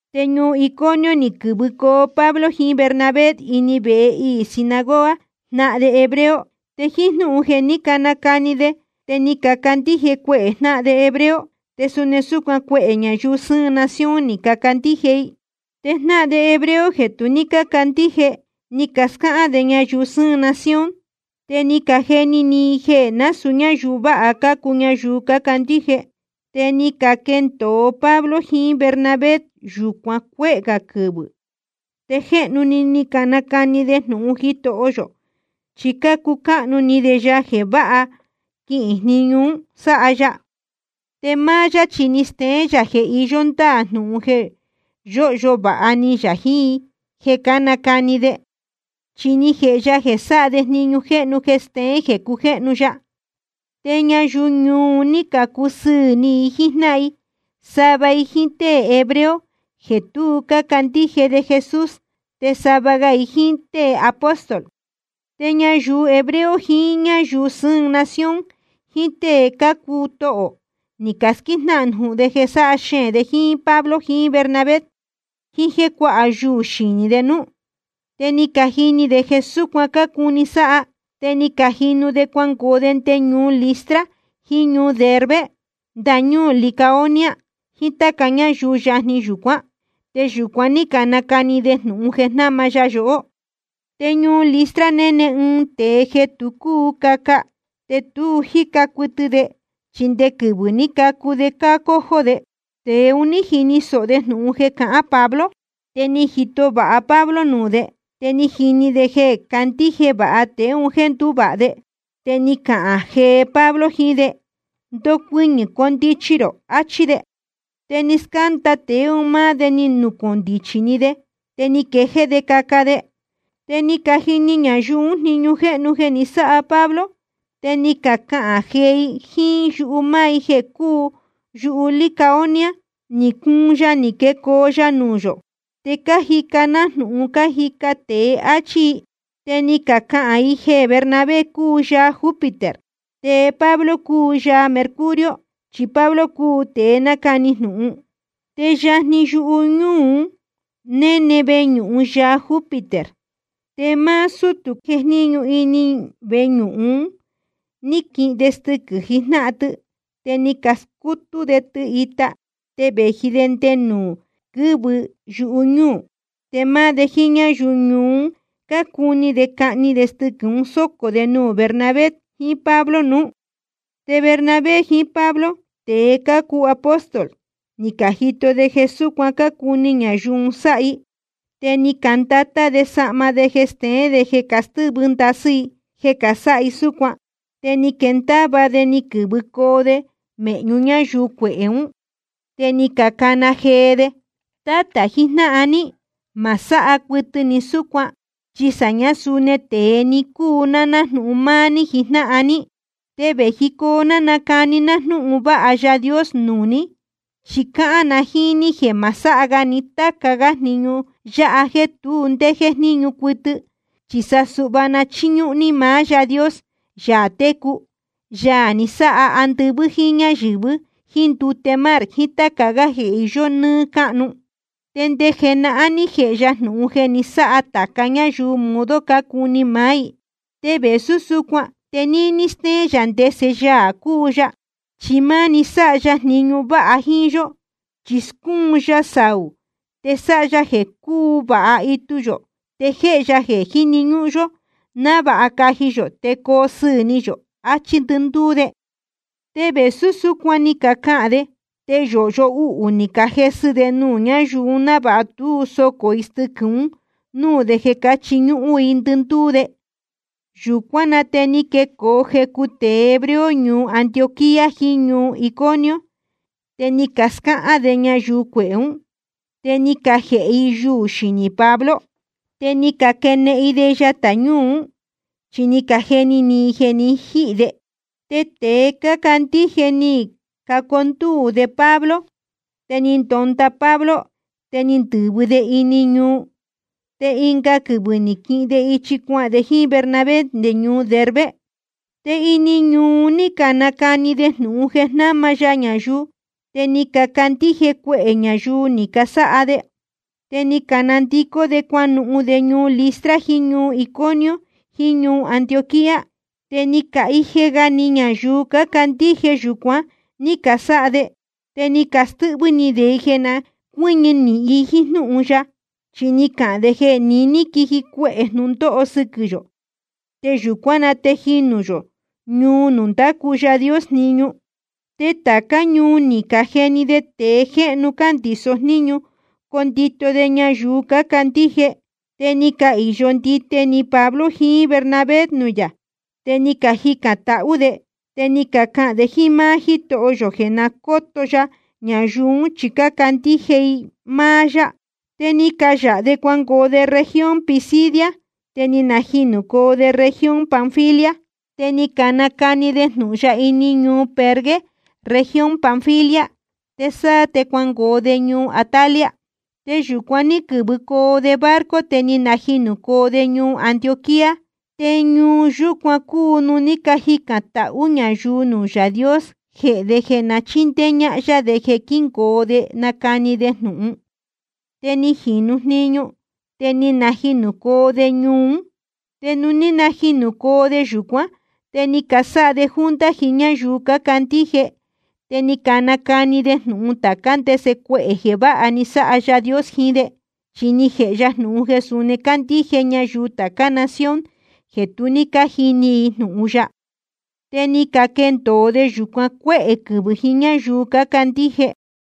Te ñuu Iconio ni quɨ̄vɨcoo Pablo jiín Bernabé ini vehe iī sinagoga jnáhan de hebreo. Te jíín jnúhun jeē ní canacani de te ni cacandíje cuehē jnáhan de hebreo, te suni súcuan cuehē ñayuu sɨ́ɨn nación ni cacandíje i. Te jnáhan de hebreo jeē tu ní cácandíje, ni cascáhán de ñayuu sɨ́ɨn nación, te ni cajeni ni i jeē násūu ñáyuu váha cácuu ñayuu cácandíje. Te ni caquendōo Pablo jiín Bernabé yūcuan cuéhē gā quɨvɨ̄. Te jéhnu-ni ni canacani de jnūhun Jitoho yō, chi cácucáhnu ni de ya jeē váha quihīn jniñu un sáha ya. Te máá yá chi ni steén yā jeē iyó ndáā jnūhun jeē yóhyo vāha ni yā jiín i jeē cánacani de, chi ni jēhe ya jeē sáha de jniñu jéhnu jeē steén jeē cujéhnu ya. Te ñayuu ñuu un ní cacusɨ́ɨn ni i jíjnáhan i, sava i jíín tée hebreo jeē tu cácandíje de Jesús, te sava ga i jíín tée apóstol. Te ñayuu hebreo jiín ñáyuu sɨ́ɨn nación jiín tée cácuu tohō ni casquíjnáhan jnūhun jeē sáha xeēn jiín Pablo jiín Bernabé, jiín jéē cuáha yuū xinī de núú. Te ni cajini de jeē súcuan cácuni sáha, te ni cajinu de cuangoo de nde ñuu Listra jiín ñuu Derbe ndañúū Licaonia jiín táca ñuu yajni yūcuán. Te yūcuan ní canacani de jnūhun jeē jnáma ya yohó. Te ñuu Listra néne ɨɨn tēe jeē tu cúu caca, te tu jíca cuɨtɨ de chi nde quɨvɨ̄ ní cacu de cácójó de. Tēe un ní jini sōho de jnūhun jeē cahán Pablo, te ni jito vāha Pablo nuū de, te ni jini de jeē candíje vāha tēe un jéē ndúvāha de. Te ni cahān jee Pablo jiín de: Ndocuɨñɨ̄, condichi rō, achí de. Te ni scánda tēe un máá de ni nucōndichi‑ni de, te ni quejéé de caca de. Te ni cajini ñayuu ún jniñu jéhnu jeē ni sáha Pablo, te ni cacahān jee i jíín yuhu máá i jeē cúu yuhu Licaonia: Ni cuun yaā ni quecoo nuū yō, te cájica nájnūhun cájica tēe, áchí i. Te ni cacahān i jeē Bernabé cúu yaā Júpiter, te Pablo cúu yaā Mercurio chi Pablo cúu tēe nácani jnūhun. Te yajni yuñúū un néne veñūhun yaā Júpiter. Te máá sútū jejníñu ini veñūhun un ní quihin de stɨquɨ̄ jijnáhan tɨ te ni scutú de tɨ ita te vēji de nde nuū quɨ́vɨ i yuñúū, te máá de jíín ñáyuu ñuu un cácuni de cahni de stɨquɨ̄ un sócō de nuū Bernabé jiín Pablo nuú. Te Bernabé jiín Pablo, tēe cácuu apóstol, ni cajito de jeē súcuan cácuni ñayuu un sáha i, te ni candatá de sahma de jeē steén de jeē castɨ́vɨ ndasɨ́ i jeē casáha i súcuan. Te ni quenendava de ni quɨ̄vɨcoo de mēhñu ñáyuu cuehē ún, te ni cacana jee de: Tátā jijnáhan ní, ma sáha cuɨtɨ ni súcuan, chi sāñá suni tēe‑ni cácuu ná nájnūhun máá ní jíjnáhan ní. Te vējicoo ná nacani ná jnúhun vāha Yaā Dios nuū ní, chi cahān na jíín ní jeē ma sáha ga ni táca jniñu yáha jéē tu ndé jéjníñu cuɨtɨ, chi sa suhva na chíñúhún ní maá Yáā Dios, Yaā técu, Yaā ni sáha andɨvɨ́ jíín ñáyɨ̄vɨ jíín ndute mar jiín táca gá jeē iyó nɨ́ɨ́ cáhnu. Te nde jenahán ní jēhe ya jnūhun jeē na sáha tāca ñáyuu modo cácuni maá i. Te vēsú súcuan te níní stéén yā ndese Yaā cúu ya, chi máni sáha ya jniñu váha jíín yó, chi scúun ya saū, te sáha ya jeē cúu vāha itu yō, te jéhe ya jeē jíni ñúhún yó návāha caji yō te coo sɨɨ̄ ni yō, achí ndɨndúú de. Te vēsú súcuan ni cacahān de, te yōhyo uhū ni cajesɨ de nuū ñáyuu un návāha tú socō i stɨquɨ̄ un núū de jeē chiñúhún i ndɨndúú de. Yūcuán na te ni quecoo jecu tēe hebreo ñuu Antioquía jiín ñuu Iconio, te ni cascáhán de ñayuu cuehē ún, te ni cajēhe i yuū xinī Pablo. Te ni caquenehen i de yatā ñúū ún, chi ni cajeni ni i jeē jé ni jihī de. Te tēe cácandíje ni cacondúū de Pablo, te ni ndonda Pablo, te ni ndɨ̄vɨ de ini ñuu. Te ɨnga quɨvɨ̄ ni quihin de ichi cuahān de jíín Bernabé nde ñuu Derbe. Te ini ñuu un ní canacani de jnūhun jeē jnáma ya ñayuu, te ni cacandíje cuehē ñayuu ni casáha de. Te ni canandicó de cuanuhun de ñuu Listra jiín ñuu Iconio jiín ñuu Antioquía. Te ni cahije ga ni ñayuu cácandíje yūcuan ní casáha de. Te ni castɨ́hvɨ́ ni de i jeē na cuɨ́ñɨ nīhin i jíín jnúhun ya, chi ni cacahān de jeē niní quiji cuehē jnūndóho sɨquɨ̄ yō te yūcuán na te jinū yō ñuu nuū ndácu Yaā Dios jniñu. Te tācá ñuu ni cajeni de tēe jéhnu cándīso jníñu condito de ñayuu cácandíje. Te ni cahīyo ndite ni Pablo jiín Bernabé nuū yā, te ni cajicān tahú de, te ni cacahān de jíín máá Jítoho yō jeē na cóto ya ñayuu ún chi cácandíje i máá yá. Te ni cayāha de cuangoo de región Pisidia, te ni najinūcoo de región Panfilia. Te ni canacani de jnūhun ya ini ñuu Perge región Panfilia, te sáá te cuangoo de ñuu Atalia. Te yūcuan ní quɨ̄vɨcoo de barco, te ni najinūcoo de ñuu Antioquía. Te ñuu yúcuan cúu nuū ní cajicān tahú ñayuu nuū Yaā Dios jehē de jeē na chíndéé ñáhán yá de jeē quíngoo de nacani de jnūhun. Te ni jīnu jniñu, te ni najinūcoo de ñuu ún. Te nuū ní najinūcoo de yūcuán, te ni casáha de junta jiín ñáyuu cácandíje, te ni canacani de jnūhun tācá ndese cuehē jeē váha ni sáha Yaā Dios jiín de, chi ni jēhe ya jnūhun jeē suni candíje ñayuu tācá nación jeē tu ní cájini i jnūhun ya. Te ni caquendōo de yūcuan cuéhē quɨvɨ̄ jiín ñáyuu cácandíje.